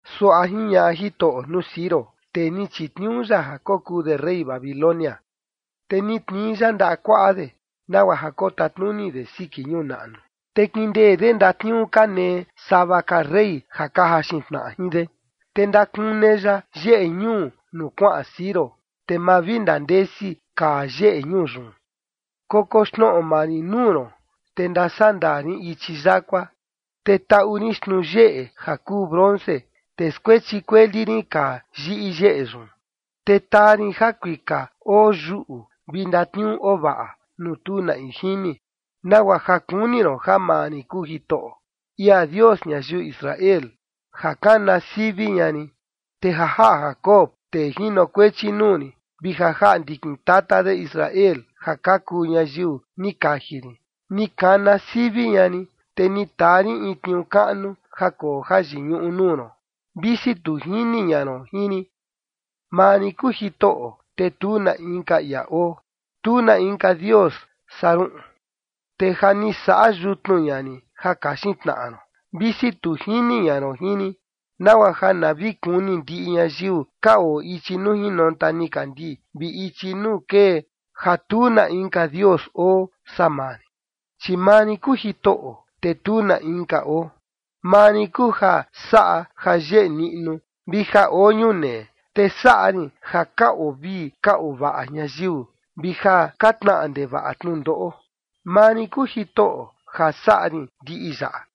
Suaꞌa jiñaꞌa Jitoꞌo nuu Ciro, tee ni chitniuu ya ja kokuu de rey Babilonia, te ni tnii ya ndaꞌa kuaꞌa de, nagua ja kotatnuni de siki ñuu naꞌnu, te kindee de ndatniuu ja ka nee sava ka rey ja ka jaxin tnaꞌa jin de, te ndakune ya yeꞌe ñuu nuu kuaꞌan Ciro, te ma vi ndandesi ka yeꞌe ñuu yun: “Koxnoꞌo maa rin nuu ron, te ndasandaa rin ichi yakua, te taꞌu rin xtnuu yeꞌe ja kuu bronce, te skuechi kueli rin kaa yiꞌi yeꞌe yun. Te taa rin jakuika oo yuꞌu vi ndatniuu oo vaꞌa nuu tu na in jini, nagua ja kuni ron ja maa rin kuu Jitoꞌo, ia Dios ñayiu Israel, ja kana sivi ña rin. Te ja jaꞌa Jacob, tee jinokuechi nuu rin vi ja jaꞌa ndikin tata de Israel ja ka kuu ñayiu ni kaji rin, ni kana sivi ña rin, te ni taa rin in tniuu kaꞌnu ja koo jayiñuꞌu nuu ron, visi tu jini ña ron jin rin. Maa rin kuu Jitoꞌo, te tu na inka ia oo, tu na inka Dios saa ruꞌun. Te ja ni saꞌa yutnu ña rin ja kaxin tnaꞌa ron, visi tu jini ña ron jin rin, nagua ja na vi kuni ndiꞌi ñayiu ka oo ichi nuu jinonta nikandii vi ichi nuu kee, ja tu na inka Dios oo saa maa rin, chi maa rin kuu Jitoꞌo, te tu na inka oo. Maa rin kuu ja saꞌa jayeꞌe niꞌnu vi ja oo ñunee, te saꞌa rin ja ka oo vii ka oo vaꞌa ñayiu, vi ja ka tnaꞌa ndevaꞌa tnundoꞌo. Maa rin kuu Jitoꞌo ja saꞌa rin ndiꞌi yaꞌa.”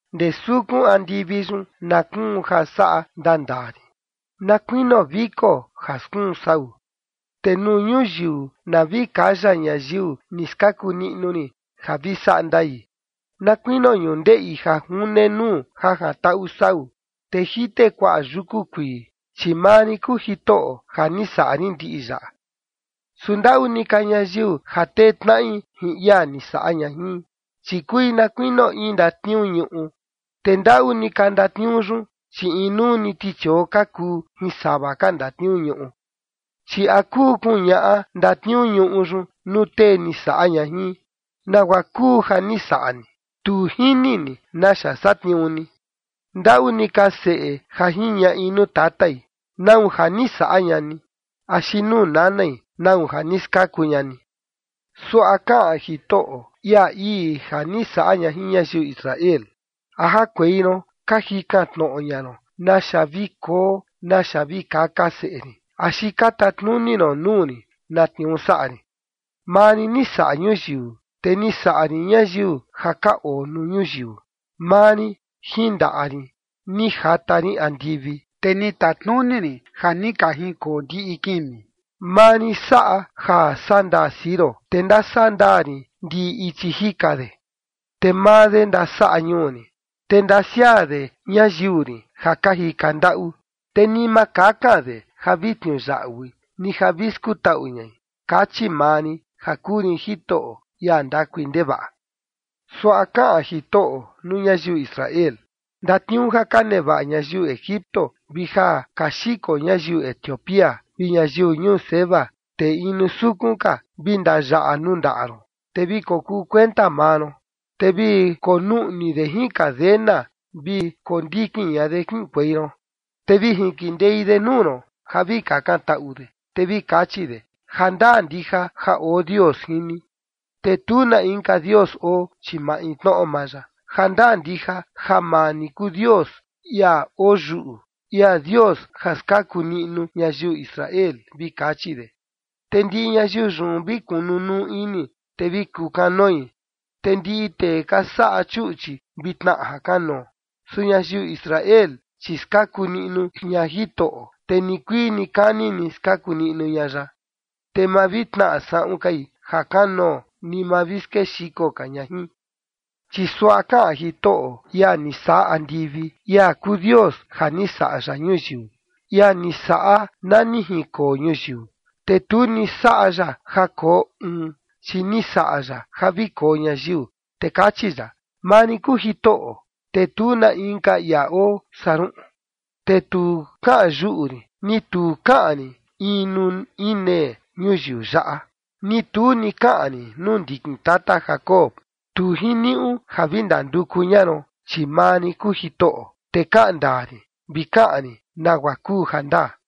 “Ndee sukun andivi yun na kuun ja saꞌa ndaa ndaa rin, na kuinio viko ja skuun sau. Te nuu ñuyiu na vi kaya ñayiu ni skaku niꞌnu rin ja vi saꞌa ndai, na kuinio ñundeꞌi ja june nuu ja jantaꞌu sau, te jite kuaꞌa yuku kuii, chi maa rin kuu Jitoꞌo ja ni saꞌa rin ndiꞌi yaꞌa.” “Su ndaꞌu ni ka ñayiu ja tee tnaꞌi jin ia ni saꞌa ña jin, chi kui na kuinio in ndatniuu ñuꞌu, te ndaꞌu ni ka ndatniuu yun, chi inuu ni tichioo ka kuu jin sava ka ndatniuu ñuꞌu. Chi ¿a kuu kuñaꞌa ndatniuu ñuꞌu yun nuu tee ni saꞌa ña jin: Nagua kuu ja ni saꞌa ni? Tu jini ni naxa satniuu ni. Ndaꞌu ni ka seꞌe ja jiñaꞌi nuu tatai: ¿Nau ja ni saꞌa ña ni? Axi nuu nanai: ¿Nau ja ni skaku ña ni?” Suaꞌa kaꞌan Jitoꞌo, ia ii ja ni saꞌa ña jin ñayiu Israel: “¿A jakuei ron ka jikan tnoꞌo ña ron naxa vi koo naxa vi kaka seꞌe rin, axi ka tatnuni ron nuu rin na tniuu saꞌa rin? Maa rin ni saꞌa ñuyiu, te ni saꞌa rin ñayiu ja ka oo nuu ñuyiu. Maa rin jin ndaꞌa rin ni jata rin andivi, te ni tatnuni rin ja ni ka jinkoo ndiꞌi kimi. Maa rin saꞌa ja saꞌa ndaa Ciro, te ndasaꞌa ndaa rin ndiꞌi ichi jika de. Te maa de ndasaꞌa ñuu rin, te ndasiaa de ñayiu rin ja ka jika ndaꞌu. Te ni ma kakan de ja vi tniuyaꞌui, ni ja vi skutaꞌu ñai, kachi maa rin ja kuu rin Jitoꞌo, ia ndakui ndevaꞌa.” Suaꞌa kaꞌan Jitoꞌo nuu ñayiu Israel: “Ndatniuu ja ka nevaꞌa ñayiu Egipto vi ja ka xiko ñayiu Etiopía, vi ñayiu ñuu Seba, tee inu sukun ka, vi ndayaꞌa nuu ndaꞌa ron, te vi kokuu kuenta maa ron, te vi konuꞌni de jin cadena, vi kondikin ña de kiꞌinkuei ron, te vi jinkindei de nuu ron ja vi kakantaꞌu de, te vi kachi de: Jandaa ndija ja oo Dios jin ni, te tu na inka dios oo, chi maintnoꞌo maa ya”. Jandaa ndija ja maa ni kuu Dios, ia oo yuꞌu, ia Dios ja skaku niꞌnu ñayiu Israel, vi kachi de. Te ndiꞌi ñayiu yun vi kunu nuu ini, te vi kukanoi, te ndiꞌi tee ka saꞌa chuꞌchi vi tnaꞌa jakanoo. Su ñayiu Israel, chi skaku niꞌnu ña Jitoꞌo, te nikuii nikani ni skaku niꞌnu ña ya, te ma vi tnaꞌa saꞌun kai ja kanoo, ni ma vi skexiko ka ña jin. Chi suaꞌa kaꞌan Jitoꞌo, ia ni saꞌa andivi, ia kuu Dios ja ni saꞌa ya ñuyiu, ia ni saꞌa na ni jinkoo ñuyiu, te tu ni saꞌa ya ja koo uun, chi ni saꞌa ya ja vi koo ñayiu, te kachi ya: “Maa rin kuu Jitoꞌo, te tu na inka ia oo saa ruꞌun. Te tu kaꞌan yuꞌu rin, ni tu kaꞌan rin in nuu inee ñuyiu yaꞌa, ni tu ni kaꞌan rin nuu ndikin tata Jacob: Tu jiniuꞌu ja vi ndanduku ña ron. Chi maa rin kuu Jitoꞌo, te kaꞌan ndaa rin, vi kaꞌan rin nagua kuu jandaa.”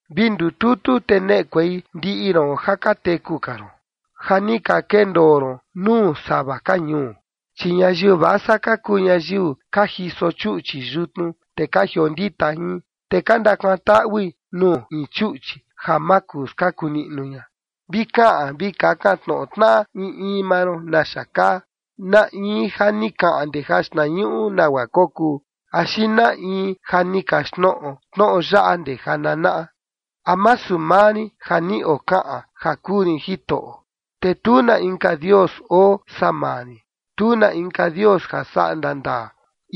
“Vi ndututu te neꞌekuei ndiꞌi ron ja ka teku ka ron, ja ni ka kendoo ron nuu sava ka ñuu. Chi ñayiu vasa ka kuu ñayiu ka jiso chuꞌchi yutnu, te ka jiondita jin, te ka ndakuatui nuu in chuꞌchi ja ma kuu skaku niꞌnu ña. Vi kaꞌan vi kakan tnoꞌo tnaꞌa in in maa ron naxa kaa, ¿na in ja ni kaꞌan ndee jaxtnañuꞌu nagua kokuu? Axi ¿na in ja ni kaxtnoꞌo tnoꞌo yaꞌa ndee jananaꞌa? ¿A masu maa rin ja ni okaꞌan ja kuu rin Jitoꞌo? Te tu na inka dios oo saa maa rin, tu na inka Dios ja saꞌa ndaa ndaa,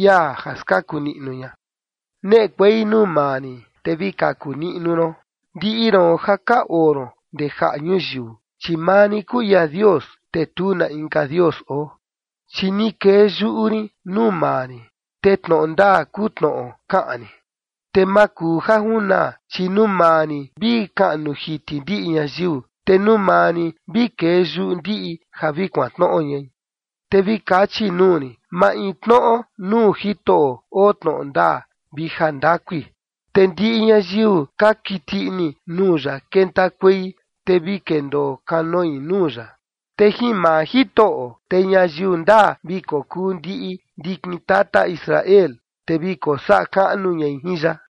ia ja skaku niꞌnu ña.” “Neꞌekuei nuu maa rin, te vi kaku niꞌnu ron, ndiꞌi ron ja ka oo ron ndee jaꞌa ñuyiu, chi maa rin kuu ia Dios, te tu na inka dios oo. Chi ni kee yuꞌu rin nuu maa rin, te tnoꞌo ndaa kuu tnoꞌo kaꞌan rin, te ma kuu ja junaa, chi nuu maa rin vi kaꞌnu jiti ndiꞌi ñayiu, te nuu maa rin vi kee yuꞌu ndiꞌi ja vi kuantnoꞌo ñai.” Te vi kachi nuu rin: “Maintnoꞌo nuu Jitoꞌo oo tnoꞌo ndaa vi jandakui”, te ndiꞌi ñayiu ka kiti ini nuu ya kentakuei, te vi kendoo kanoi nuu ya. Te jin maa Jitoꞌo, te ñayiu ndaa vi kokuu ndiꞌi ndikin tata Israel, te vi kosaꞌa kaꞌnu ñai jin ya.